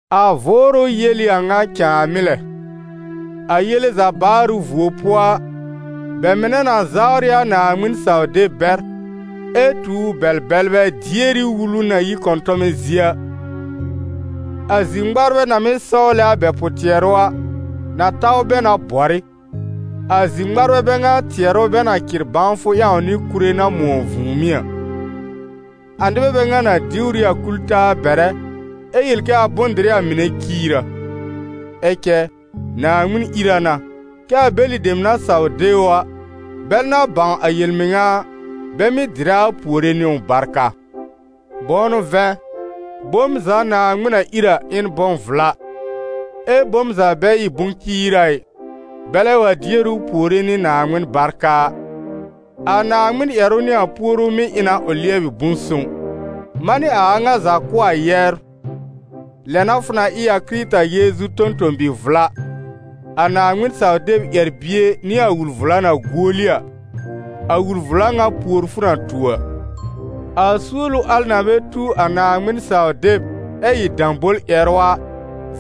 A Vʋʋrʋ yel ɩ a ŋa cãamɩ́ lɛ: a yele za baarʋ vuo pʋɔ a, bɛ mɩnɛ na zawr ɩ a Naaŋmɩn-saw-deb bɛr, ɛ tuur bɛl-bɛlbɛ dier ɩ wulu na yi kɔ̃tɔmɛ zie a. A zir-ŋmarbɛ na mɩ́ sɔwlɛ a bɛ pʋ-tɩɛrʋ a, na taw bɛ na bɔr ɩ, a zir-ŋmarbɛ bɛ ŋa tɩɛrʋ bɛ na cɩr bãwfʋ ƴãw nɩ kure na mʋ̃ɔ vũùmí a. A nɩbɛ bɛ ŋa na diwr ɩ a kul-taa bɛrɛ, ɛ yel kɛ a bʋ̃-dɩrɩ a mɩnɛ ciir a. Ɛ cɛ Naaŋmɩn ír a na, kɛ a bɛlɩ dem na saw de ʋ a, bɛl na bãw a yel-mɩŋa a, bɛ mɩ́ dɩrɛ a puore nɩ ʋ barka. Bʋ̃ʋ n'ʋ vɛ̃, bom za Naaŋmɩn na ír a, ɩ n bʋ̃-vla, ɛ bom za bɛ ɩ bʋ̃-ciira ɩ, bɛlɛ wa dier ʋ puore nɩ Naaŋmɩn barka a. A Naaŋmɩn ƴɛrʋ nɩ a puoru mɩ́ ɩ na ʋ lɩɛbɩ bʋ̃-sõw. Manɩ a a ŋa za kʋ̀ a yɛbr, lɛ n'a fʋ na ɩ a Kɩrɩta Yeezu tõ-tõ-bi-vla, a Naaŋmɩn-saw-deb ƴɛr-bie nɩ a wul-vla na guoli a, a wul-vla ŋa pùor fʋ na tu a. A suolu al na bɛ tu a Naaŋmɩn-saw-deb ɛ ɩ dãbol-ƴɛrʋ a,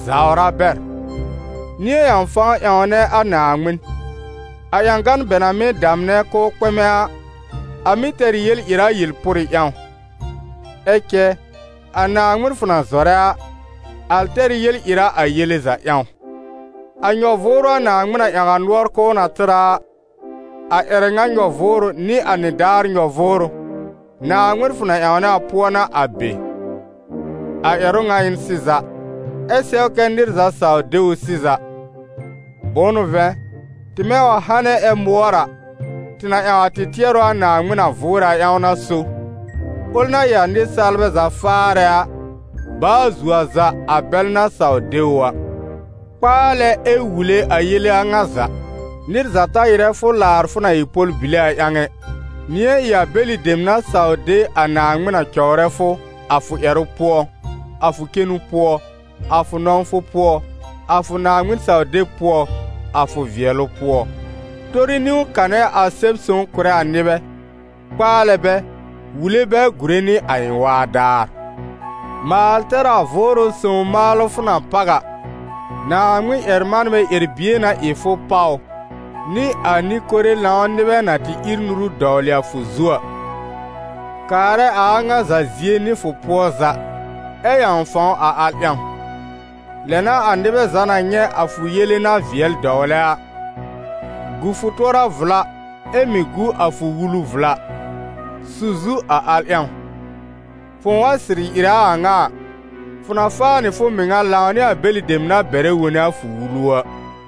zawr a bɛr. Nɩ̃ɛ ƴãw fãw ƴãwnɛ a Naaŋmɩn. A ƴãgan bɛ na mɩ́ damnɛ k'ʋʋ kpɛmɛ a, a mɩ́ tɛr ɩ yel-ɩra yel-pʋrɩ ƴãw; ɛ cɛ a Naaŋmɩn fʋ na zɔrɛ a, a tɛr yel-ɩra a yele za ƴãw. A nyɔ-vʋʋrʋ a Naaŋmɩn na ƴãw a nʋɔr k'ʋʋ na tɩr a a, a ƴɛrɛ ŋa nyɔ-vʋʋrʋ nɩ a nɩdaar nyɔ-vʋʋrʋ, Naaŋmɩn fʋ na ƴãwnɛ a pʋɔ n'a a be. A ƴɛrʋ ŋa ɩ n sɩza, ɛ sɛw kɛ nɩr za saw de ʋ sɩza. Bʋ̃ʋ n'ʋ vɛ̃, tɩmɛ wa hanɛ ɛ mʋɔr a, tɩ na ƴãw a tɩ tɩɛrʋ a Naaŋmɩn na vʋʋrɛ a ƴãw a n'a so, ʋl na ɩ a nɩsaalbɛ za faarɛ a, baa zuo a za a bɛl na saw de ʋ a. Kpaalɛ ɛ wule a yele a ŋa za. Nɩr za ta ɩrɛ fʋ laar fʋ na ɩ pɔl-bile a ƴãw ɩ. Nɩ̃ɛ ɩ a bɛlɩ dem na saw de a Naaŋmɩn a cɔwrɛ fʋ, a fʋ ƴɛrʋ pʋɔ, a fʋ cenu pʋɔ, a fʋ nɔ̃wfʋ pʋɔ, a fʋ Naaŋmɩn-saw-deb pʋɔ, a fʋ vɩɛlʋ pʋɔ. Tori niwn kanɛ a Sɛb-sõw kʋ̀rɛ a nɩbɛ, kpaalɛ bɛ, wule bɛ gùre nɩ a ɩ̃ waa daar. Maal tɛr a Vʋʋrʋ Sõw maalʋ fʋ na páw a, Naaŋmɩn-ƴɛr-manbɛ ƴɛr-bie n'a ɩ fʋ páw ʋ, nɩ a nɩ-kore lãw nɩbɛ na tɩ ír nuru dɔwlɩ a fʋ zu a. Kaarɛ a a ŋa za zie nɩ fʋ pʋɔ za, ɛ ƴãw fãw a al ƴãw. Lɛ n'a a nɩbɛ za na nyɛ̃ a fʋ yele na vɩɛl dɔwlɛ a. Gu fʋ tʋɔra vla ɛ mɩ̀ gu a fʋ wulu vla. Su zu a al ƴãw. Fʋ̃ʋ wa sɩrɩ ɩrɛ a a ŋa a, fʋ na faa nɩ fʋ mɩŋa lãw nɩ a bɛlɩ dem na bɛrɛ wone a fʋ wulu a.